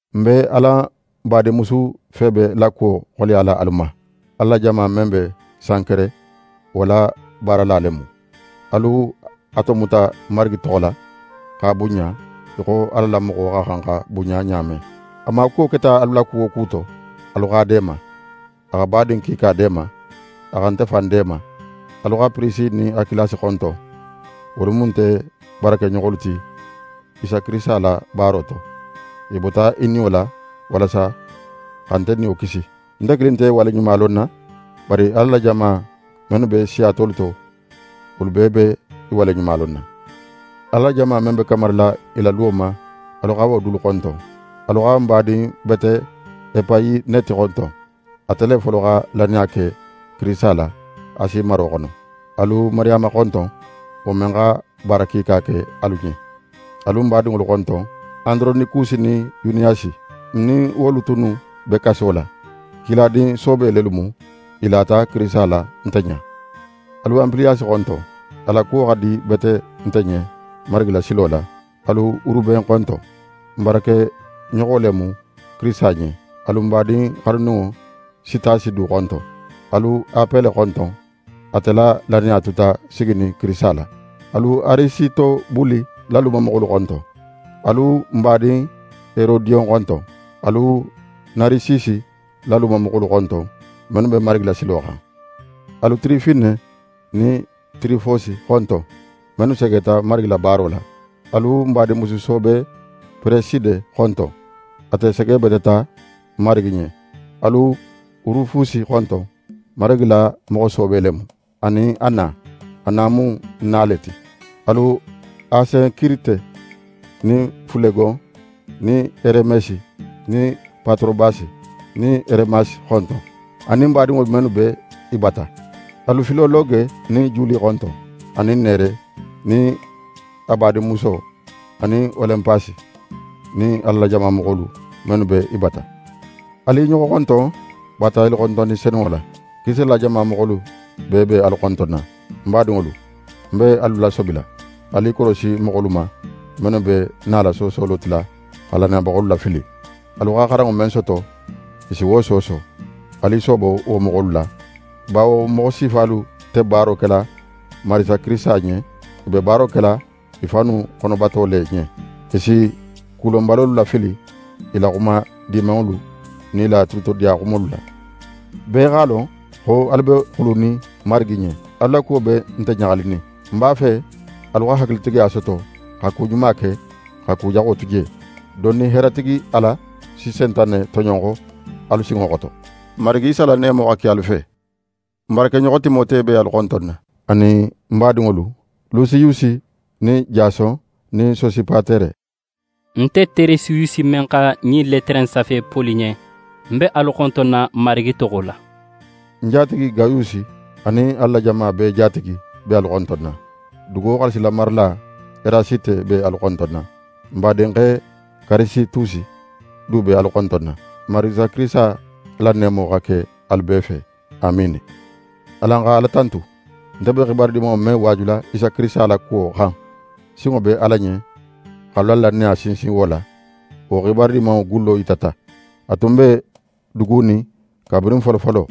Ń be alan badinmusu Febe la kuwo xoleyala alu ma. Ala la jama men be Sankere, wo la baarala le mu. Alu a tomuta Marigi toxo la, x'a bunɲa í xo Ala la moxo xa xan xa bunɲa ɲa men. A maakuwo keta alu la ku wo ku to, alu x'a deema. A xa badin kiika deema. A xa nte fan deema. Alu xa Pirisiye nin Akilasi xonton. Wolu mu nte baarakeɲoxolu ti, Isa Kirisita la baaro to. I bota i niyo la, walasa xa nte niyo kisi. Nte kilin nte i waleɲumalonna, bari Ala la jama mennu be siya tolu to, wolu bee be i waleɲumalonna. Ala la jama men be kamarila i la luwo ma, alu xa wo dulu xonton. Alu xa ń badin bete Epayineti xonton. Ate le folo xa lannaya ke Kirisita la, Asi maro xono. Alu Mariyama xonton, wo men xa baara kiika ke alu ɲen. Alu ń badinŋolu xonton: Andoronikusi nin Yuniyasi. Ń nin wolu tunnu be kaso la. Kiladin soobe lelu mu. I lata Kirisita la nte ɲa. Alu Anpiliyasi xonton. A la kuwo xa di bete nte ɲen Marigi la silo la. Alu Uruben xonton. Ń baarakeɲoxo le mu Kirisita ɲen. Alu ń badin xanuninŋo Sitasi du xonton. Alu Apele xonton. Ate la lannaya tuta siginin Kirisita la. Alu Arisitobuli la lumamoxolu xonton. Alu ń badin Herodiyon xonton. Alu Narisisi la lumamoxolu xonton, mennu be Marigi la silo xan. Alu Tirifene nin Tirifose xonton, mennu segeta Marigi la baaro la. Alu ń badinmusu soobe Pereside xonton. Ate segebeteta n Marigi ɲen. Alu Rufusi xonton, Marigi la moxo soobe le mu, anin a na. A na mu ń na le ti. Alu Asenkirite nin Fulegon nin Heremesi nin Patorobasi nin Heremasi xonton, anin badinŋolu mennu be i bata. Alu Filologe nin Juli xonton, anin Nere nin a badinmuso anin Olinpasi nin Ala la moxolu mennu be i bata. Alu i ɲoxo xonton baatayalixontonni senunŋo la. Kirisita la jama moxolu bee be alu xontonna. Ń badinŋolu, ń be alu lasobila: Alu i korosi moxolu ma, mennu be nala soosolo tila, xa lannayabaxolu lafili. Alu xa xaranŋo men soto, i si wo sooso. Alu i soobo wo moxolu la. Bawo wo moxo sifalu nte baaro kela n Marigi Kirisita ɲen. I be baaro kela i fannu xonobato le ɲen. I si kulonbalolu lafili i la xuma dimanŋolu nin i la tulutodiya xumolu la. Bee x'a lon xo alu be xulunin Marigi ɲen. Alu la wo kuwo be nte ɲaxalinin. Ń b'a fe alu xa hakilitigiya soto xa ku ɲuma ke, xa ku jaxo tu je. Dondin, heeratigi Ala si Sentane toɲonxo alu sinŋo xoto. N Marigi Isa la neemo xa ke alu fe! Ń baarakeɲoxo Timote be alu xontonna, a nin ń badinŋolu: Lusiyusi nin Jason nin Sosipatere. Nte Teretiyusi men xa ɲin letere in safe Poli ɲen, ń be alu xontonna Marigi toxo la. Ń jatigi Gayusi, anin Ala la jama bee jatigi, be alu xontonna. Dugo xaalisimarala Erasite be alu xontonna. N badinxe Karitusi du be alu xontonna. [ N Marigi Isa Kirisita la neemo xa ke alu bee fe. Amiini!] Alan xa Ala tantu! Nte be xibaru Dimanŋo men waajula Isa Kirisita la kuwo xan, sinŋo be Ala ɲen x'alu la lannaya sinsin wo la. Wo Xibaru Dimanŋo gullo yitata. A tun be dugunin kabirin folofolo.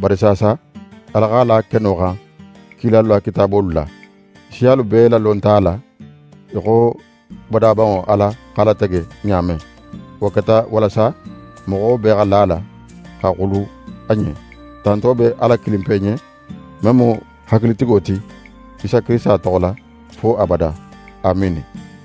Bari saasa, Ala x'a la keno xan kilalu la kitaabolu la. Siyalu bee lalonta a la, í xo badabanŋo Ala x'a latege ɲa men. Wo keta walasa moxo bee xa la a la, xa xulu a ɲen. Tanto be Ala kilinpe ɲen, men mu hakilitigo ti, Isa Kirisita toxo la, fo abada. Amiini!